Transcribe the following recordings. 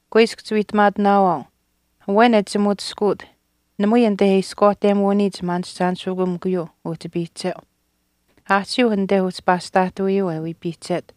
“Kuiskw chiwiihtamaatinaawaau, awen e chimutiskuut namui anite e ishkwaahtemuuniyich maanishchaanishikamikuyuu uhchi piihcheu. Aahchiiuh anite uhchi paastaahtawiyuu e wii piihchet.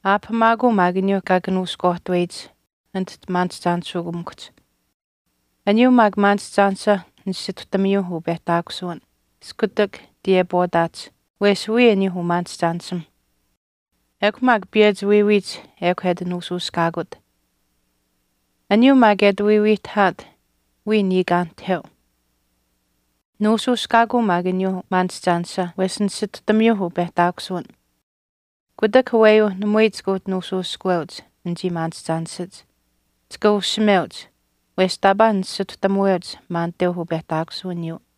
Aapahamaakuu maak aniyuu kaa kanuushkwaahtuweyich anit maanishchaanishikamikuhch. Aniyuu maak maanishchaanisha nisituhtamiyuu upehtaakusuwin iskutak tiyepwaataach wesh wiya aniyuuh umaanishchaanishim. Ekw maak piyechi wiiwiiyich ekw e ati nuushuushkaakut. Aniyuu maak e ati wiiwiihtahaat wiya niikaanihteu. Nuushuushkaakuu maak aniyuuh maanishchaanisha wesh nisituhtamiyuuh upehtaakusuwin. Kutak aweyuu namui chika uhchi nuushuushkuweuch anichii maanishchaanishach. Chika ushimeuch, wesh taapaa nisituhtamuweuch maaniteuh upehtaakusuwiniyuu.”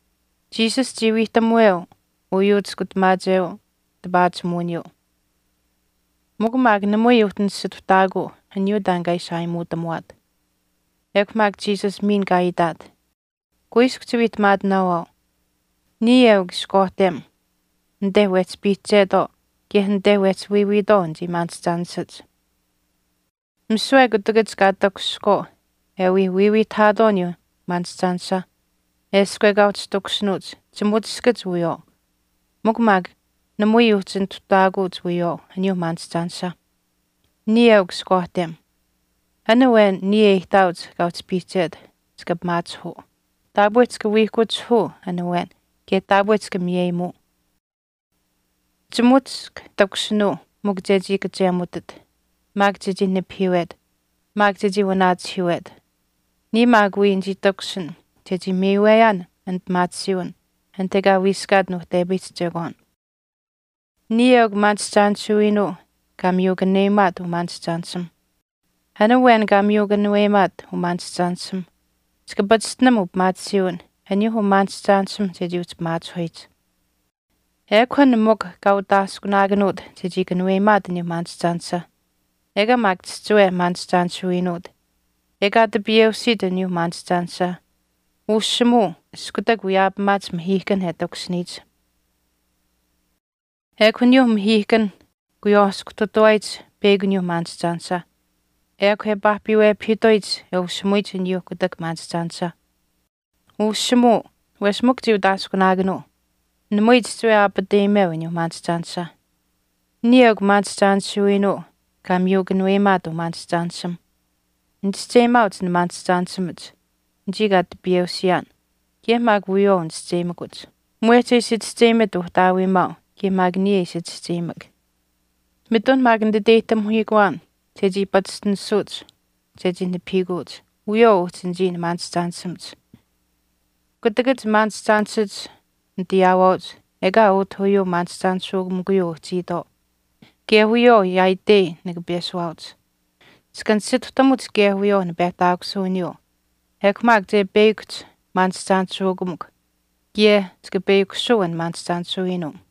Jesus chii wiihtamuweu uyuu chiskutamaacheu tipaachimuwiniyuu mikw maak namui uhchi nisituhtaakuu aniyuu taan kaa ishi aayimuutamuwaat. Ekw maak Jesus miin kaa itaat, “Kuiskw chiwiihtamaatinaawaau, niya eukw ishkwaahtem anite wehchi piihchetwaau kaye anite wehchi wiiwiitwaau anichii maanishchaanishach. Misiwe kutakach kaa takushihkwaau e wii wiiwiihtahaatwaau aniyuu maanishchaanisha eshkw ekaa uhchi takushinuuch chimutiskach wiyawaau. Mikw maak namui uhchi nituhtaakuuch wiyawaau aniyuuh maanishchaanisha. Niya eukw ishkwaahtem. An awen niya e ihtaauch kaa uhchi piihchet chika pimaachihuu. Taapwe chika wiihkuchihuu an awen kaye taapwe chika miyeyimuu. Chimutisk takushinuu mikw chechii kachemutit maak chechii nipahiiwet maak chechii waanachihiiwet. Niya maak wii nichii takushin chechii miiweyaan an pimaatisiiwin anit ekaa wiiskaat nuuhtepayihch chekwaan.” “Niya eukw maanishchaanishuiinuu kaa miyu kanuweyimaat umaanishchaanishimh. An awen kaa miyu kanuweyimaat umaanishchaanishimh chika pachishtinam upimaatisiiwin aniyuu umaanishchaanishimh chechii uhchi pimaachihuyich. Ekw an mikw kaa utaaskunaakanuut chechii kanuweyimaat aniyuu maanishchaanisha ekaa maak chihchiwe maanishchaanishuiinuut, ekaa tipiyeusiit aniyuu maanishchaanishah ushimuu iskutak wiyaapamaach mahiihkan e takushiniyich. Ekw aniyuuh mahiihkanh kuywaaskuhtutawaayich peyakw aniyuuh maanishchaanisha ekw e paahpiwepahiituyich e ushimuyich aniyuuh kutak maanishchaanisha. Ushimuu, wesh mikw chii utaaskunaakanuu. Namui chihchiwe aapateyimeu aniyuu maanishchaanisha. Niya eukw maanishchaanishuiinuu kaa miyu kanuweyimaat umaanishchaanishimh. Nichischeyimaauch nimaanishchaanishimach anichii kaa tipiyeusiyaan kaye maak wiyawaau nichischeyimakuch, mwehch e ishi chischeyimit Uhtaawiimaau kaye maak niya e ishi chischeyimak. Mitun maak nititeyihtamihiikuwaan chechii pachishtinisuuch chechii nipahiikuuch wiyawaau uhchi anichii nimaanishchaanishimach. Kutakach maanishchaanishach nitayaawaauch ekaa utah uyuu maanishchaanishikamikuyuu uhchiitwaau. Kaye wiyawaau maak yaaitei nika peshuwaauch. Chika nisituhtamuch kaye wiyawaau nipehtaakusuwiniyuu ekw maak che peyakuhch maanishchaanishikamikw kaye chika peyakushuu an maanishchaanishuiinuu.”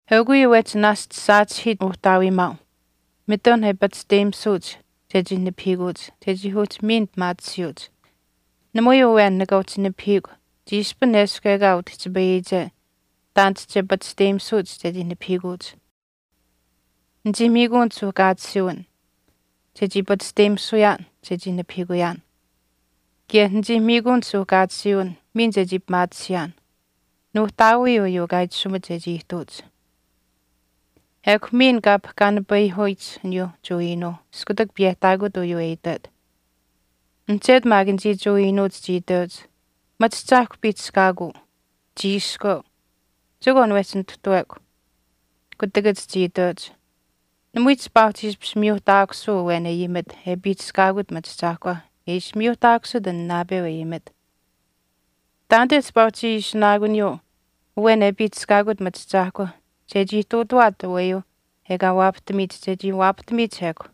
“Eukw uyuu wehchi naashch saachihiit Uhtaawiimaau mitun e pachishteyimisuuch chechii nipahiikuuch chechii uhchi miin pimaatisiyuuch. Namui awen nika chii nipahiikw chiishpin eshkw ekaa utihchipayiyiche taanit che pachishteyimisuuch chechii nipahiikuuch. Nichii miikuun suuhkaatisiiwin chechii pachishteyimisuyaan chechii nipahiikuyaan kaye nichii miikuun suuhkaatisiiwin miin chechii pimaatisiyaan. Nuuhtaawii uyuu kaa itashumit chechii ihtuuch.” Ekw miin kaa pahkaanipayihuyich aniyuuh Jewa iinuuh iskutak piyehtaakut uyuu e itwet. Mihchetu maak anichii Jewa iinuuch chii iteuch, “Machiahchaahkwa piihchishkaakuu. Chiiskweu. Chekwaan wehchi nituhtawekw.” Kutakach chii itweuch, “Namui chipaa uhchi ishpish miyuuhtaakusuu awen e ayimit e piihchishkaakut machiahchaahkwa e ishpish miyuuhtaakusit uu naapeu e ayimit. Taanite chipaa chii uhchi ishinaakuniyuu awen e piihchishkaakut machiahchaahkwa chechii ihtuutuwaat aweyuu ekaa waapahtamiyich chechii waapahtamiyich ekw.”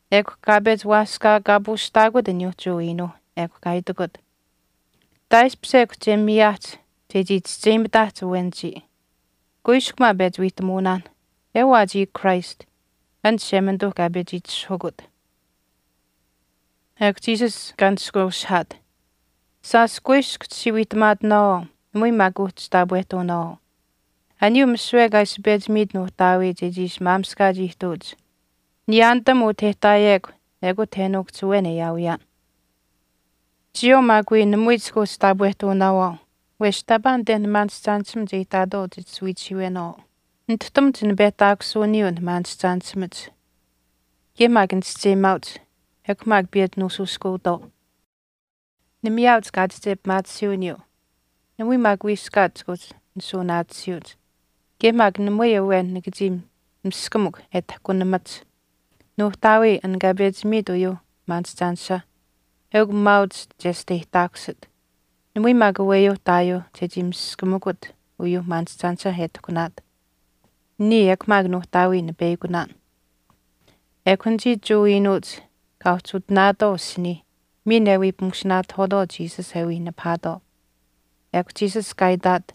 Ekw kaa pechi waaskaakaapuushtaakut aniyuuh Jewa iinuuh. Ekw kaa itikut, “Taaishpish ekw che miyaahch chechii chischeyimitaahch awen chiya. Kuiskw maa pechi wiihtamuunaan, ewaa chiya Christ an Chishemanituuh kaa pechi itishahukut.” Ekw Jesus neshkweushihaat, “Shaash kuiskw chichii wiihtamaatinaawaau namui maak kuuhchi wii taapwehtuunaawaau. Aniyuu misiwe kaa ishi pechi miit Nuuhtaawii chechii ishi maamishkaach ihtuuch niyaanitam utah e ihtaayekw ekut e nuukuhch awen e aawiyaan. Chiyawaau maak wii namui chika uhchi taapwehtuunaawaau wesh taapaa anite nimaanishchaanishimach e ihtaatwaau chit ishi wiichihiiwenaawaau. Nituhtamuch nipehtaakusuwiniyuu nimaanishchaanishimach. Kaye maak nichischeyimaauch, ekw maak piyechi nuushuushkuutwaau. Nimiyaauch kaachiche pimaatisiiwiniyuu, namui maak wiiskaat chika uhchi nisuunaatisiyuuch. Kaye maak namui awen nika chii miskamukw e tahkunamach. Nuuhtaawii, an kaa pechi miit uyuu maanishchaanisha, eukw maauch chesteyihtaakusit. Namui maak aweyuuh ihtaayuuh chechii miskamikut uyuuh maanishchaanisha e tahkunaat. Niya ekw maak Nuuhtaawii nipeyakunaan.” Ekw anichii Jewa iinuuch kaa uhchi utinaatwaau asinii miin e wii pimushinaatahwaatwaau Jesus e wii nipahaatwaau. Ekw Jesus kaa itaat,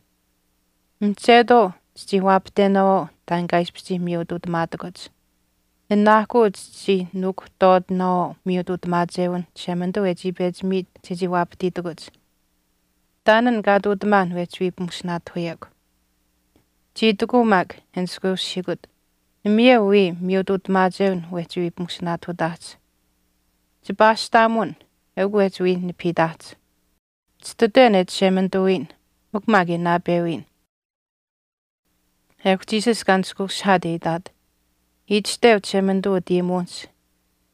“Mihchetwaau chichii waapahtenaawaau taan kaa ishpish chii miyutuutamaatakuch. Nanaahkuu chichii nuukuhtwaatinaawaau miyutuutamaachewinh Chishemanituu e chii pechi miit chechii waapahtiitikuch. Taan an kaa ihtuutamaan wehchi wii pimushinaatahuyekw.” Chii itikuu maak e niskweshihiikut, “Namayeu wii miyutuutamaachewin wehchi wii pimushinaatahutaahch, chipaashtaamun eukw wehchi wii nipahiitaahch. Chititwen e Chishemanituwiyin mikw maak e naapewiyin.” Ekw Jesus kaa nishkweushihaat e itaat, “Itashteu Chishemanituu utayimuwinihch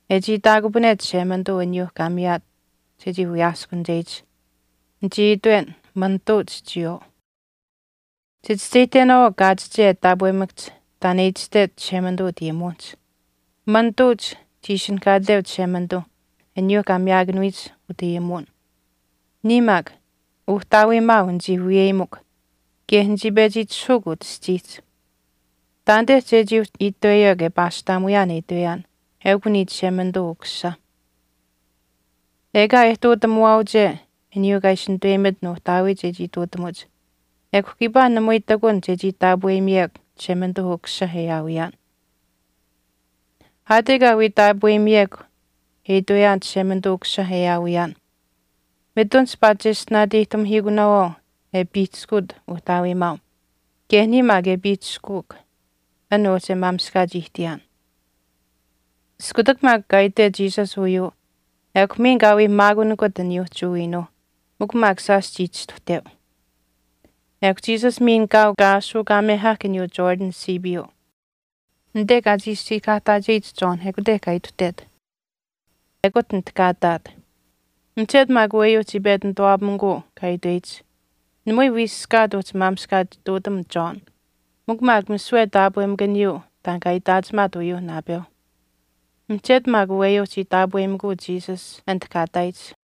e chii itaakupane Chishemanituu aniyuu kaa miyaat chechii wiyaaskunicheyich, Nichii itwen, manituuch chiyawaau. Chichischeyihtenaanuu kaachiche e taapwemakahch taan e itashtech Chishemanituu utayimuwinihch. Manituuch chii ishinihkaateu Chishemanituu aniyuuh kaa miyaakanuyich utayimuwin. Niya maak, Uhtaawiimaau nichii wiyeyimikw kaye nichii pechi itishahuukw utah aschiihch. Taanite chechii uhchi itweyekw e paashtaamuyaan e itweyaan, eukw niya Chishemanituu Ukusisa. Ekaa e ihtuutamuwaauche aniyuu kaa ishi nituweyimit Nuuhtaawii chechii ihtuutamuch ekw kiipaa namui ihtakun chechii taapweyimiyekw Chishemanituu Ukusisa e aawiyaan. Aat ekaa wii taapweyimiyekw e itweyaan Chishemanituu Ukusisa e awiyaan mitun chipaa cheshtinaateyihtamihiikunaawaau e piihchishkuut Uhtaawiimaau kaye niya maak e piihchishkuuk an uhchi e maamishkaach ihtiyaan.” Iskutak maak kaa itwet Jesus uyuu ekw miin kaa wii maakunikut aniyuu Jewa iinuuh, mikw maak shaash chii chistuhteu. Ekw Jesus miin kaau kaa aashuukaamehahk aniyuu Jordan siipiiyuu. Anite kaa chii siikahaahtaacheyich John ekute kaa ituhtet. Ekut anit kaa ihtaat. Mihchetu maak aweyuu chii pechi nituwaapamikuu kaa itweyich, “Namui wiiskaat uhchi maamishkaach ihtuutam John, mikw maak misiwe taapwemakaniyuu taan kaa itaachimaat uyuuh naapeuh.” Mihchetu maak aweyuu chii taapweyimikuu Jesus anit kaa ihtaayich.